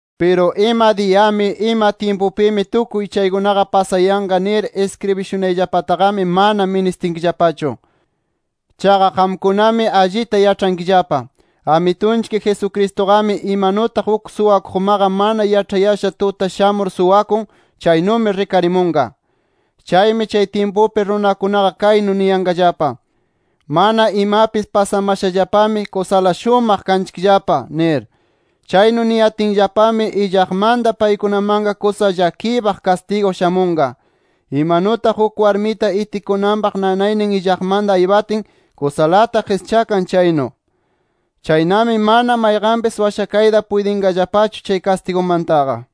Piru ima diyami, ima tyimpumi tukuy chaykuna pasayanqa, nir iskribishunayllapataqami mana ministinkillapachu. Chaqa qamkunami allita yaĉhankillapa, Amitunchik Jesucristuqami imanutaq uk suwakuqmaqa mana yaĉhayasha tuta shamur suwakun, chaynumi rikarimunqa. Chaymi chay tyimpupi runakunaqa kaynu niyanqallapa: “Mana imapis pasamashallapami, kusala shumaq kanchikllapa” nir. Chaynu niyatinllapami illaqmanta paykunamanqa kusa llakiypaq kastigu shamunqa, imanutaq uk warmita itikunanpaq nanaynin illaqmanta aypatin kusalata qischakan chaynu. Chaynami mana mayqanpis washakayta puytinqallapachu chay kastigumantaqa.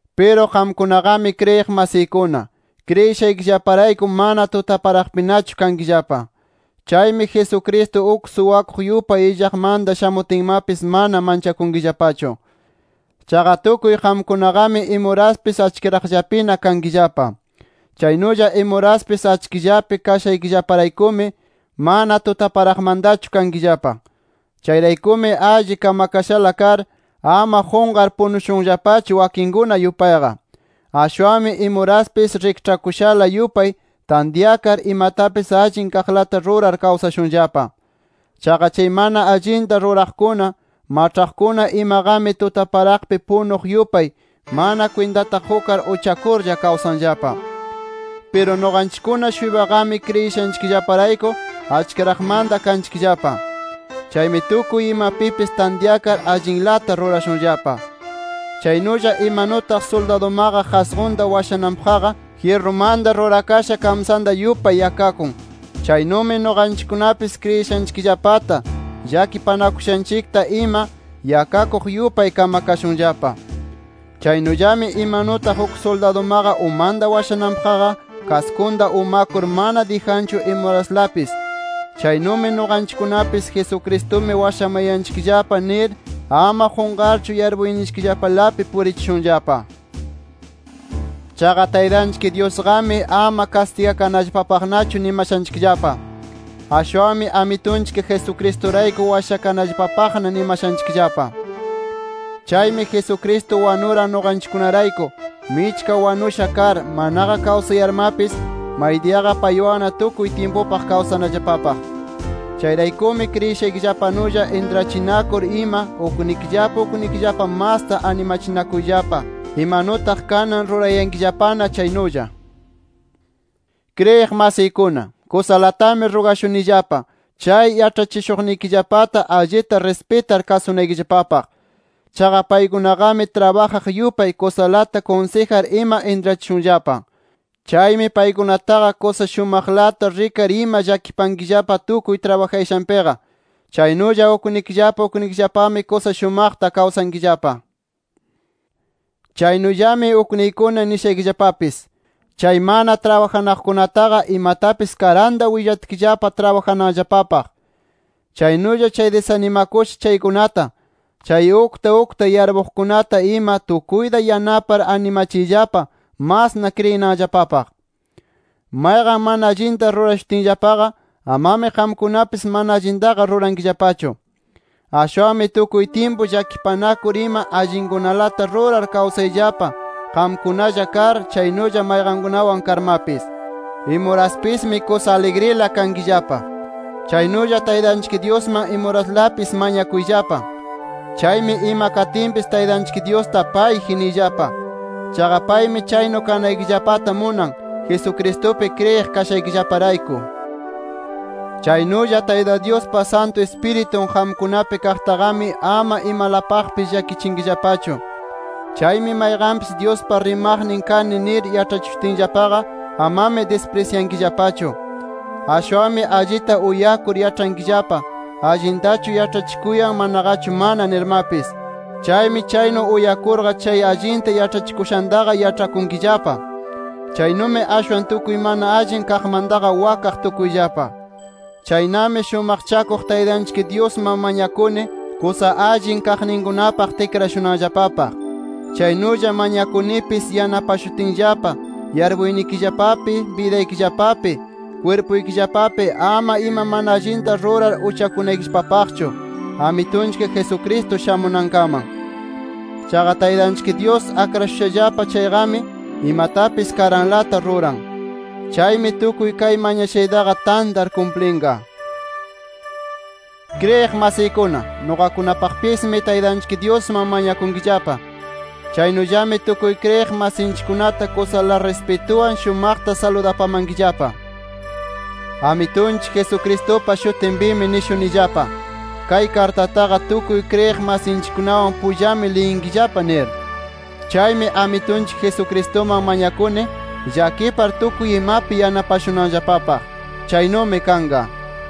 Piru qamkunaqami kriyiq masiykuna, kriyishaykillaparayku mana tutaparaqpinachu kankillapa. Chaymi Jesucristo uk suwakuq yupay illaqmanta shamutinmapis mana manchakunkillapachu. Chaqa tukuy qamkunaqami imuraspis achkiraqllapina kankillapa. Chaynulla imuraspis achkillapi kashanchikllaparaykumi, mana tutaparaqmantachu kanchikllapa. Chayraykumi alli kamakashala kar, ama qunqar punushunllapachu wakinkuna yupayqa. Ashwanmi imuraspis rikĉhakushala yupay tantyakar, imatapis allin kaqlata rurar kawsashunllapa. Chaqa chay mana allinta ruraqkuna, maĉhaqkuna imaqami tutaparaqpi punuq yupay mana kwintata qukar, uchakurlla kawsanllapa. Piru nuqanchikkuna-shuypaqami kriyishanchikllaparayku achkiraqmanta kanchikllapa. Chaymi tukuy imapipis tantyakar allinlata rurashunllapa. Chaynulla imanutaq suldadumaqa qasqunta washananpaqqa jyirrumanta rurakasha kamsanta yupay yakakun, chaynumi nuqanchikkunapis kriyishanchikllapata, llakipanakushanchikta ima yakakuq yupay kamakashunllapa. Chaynullami imanutaq uk suldadumaqa umanta washananpaqqa kaskunta umakur mana dijanchu imuraslapis, chaynumi nuqanchikkunapis Jesucristumi washamayanchikllapa nir ama qunqarchu yarpuyninchikllapalapi purichishunllapa. Chaqa Taytanchik Dyusqami ama kastigakanallapapaqnachu nimashanchikllapa. Ashwanmi Amitunchik Jesucristurayku washakanallapapaqna nimashanchikllapa. Chaymi Jesucristo wanuran nuqanchikkunarayku, michka wanusha kar, manaqa kawsayarmapis maydiyaqa paywanna tukuy tyimpupaq kawsanallapapaq. Chayraykumi kriyishaykillapanulla intrachinakur ima uknikillapa uknikillapa masta animachinakuyllapa, imanutaq kanan rurayankillapana chaynulla. Kriyiq masiykuna, kusalatami rugashunillapa chay yaĉhachishuqnikillapata allita rispitar kasunaykillapapaq. Chaqa paykunaqami trabajaq yupay kusalata kunsijar ima intrachishunllapa. Chaymi paykunataqa kusa shumaqlata rikar ima llakipankillapa, tukuy trabajayashanpiqa. Chaynulla uknikillapa uknikillapami kusa shumaqta kawsankillapa. Chaynullami ukniykuna nishaykillapapis: Chay mana trabajanaqkunataqa imatapis karanta willatkillapa trabajananllapapaq. Chaynulla chay disanimakusha chaykunata, chay ukta ukta yarpuqkunata ima tukuyta yanapar animachiyllapa masna kriyinanllapapaq. Mayqan mana allinta rurashutinllapaqa, amami qamkunapis mana allintaqa rurankillapachu. Ashwanmi tukuy tyimpu llakipanakur ima allinkunalata rurar kawsayllapa qamkunalla kar, chaynulla mayqankunawan karmapis. Imuraspismi kusa aligrila kankillapa. Chaynulla Taytanchik Dyusman imuraslapis mañakuyllapa. Chaymi ima katinpis Taytanchik Dyusta “Payji” niyllapa. Chaqa paymi chaynu kanaykillapata munan, Jesucristupi kriyiq kashaykillaparayku. Chaynulla Tayta Dyuspa Santu Ispiritun qamkunapi kaqtaqami, ama imalapaqpis llakichinkillapachu. Chaymi mayqanpis Dyuspa rimaqnin kani nir yaĉhachishutinllapaqa, amami disprisyankillapachu. Ashwanmi allita uyakur yaĉhankillapa, allintachu yaĉhachikuyan manaqachu mana nirmapis. Chaymi chaynu uyakurqa, chay allinta yaĉhachikushantaqa yaĉhakunkillapa. Chaynumi ashwan tukuy mana allin kaqmantaqa wakaq tukuyllapa. Chaynami shumaqchakuq Taytanchik Dyusman mañakuni, kusa allin kaqninkunapaq tikrashunanllapapaq. Chaynulla mañakunipis yanapashutinllapa yarpuynikillapapi, bidaykillapapi, kwirpuykillapapi ama ima mana allinta rurar uchakunaykillapapaqchu Amitunchik Jesucristo shamunankaman. Chaqa Taytanchik Dyus akrashushallapa chayqami, imatapis karanlata ruran. Chaymi tukuy kay mañashaytaqa tantar kumplinqa. Kriyiq masiykuna, nuqakunapaqpismi Taytanchik Dyusman mañakunkillapa. Chaynullami tukuy kriyiq masinchikkunata kusala rispituwan shumaqta saludapamankillapa. Amitunchik Jesucristupa shutinpimi nishunillapa: Kay kartataqa tukuy kriyiq masinchikkunawan pullami liyinkillapa nir. Chaymi Amitunchik Jesucristuman mañakuni, llakipar tukuy imapi yanapashunanllapapaq. Chaynumi kanqa.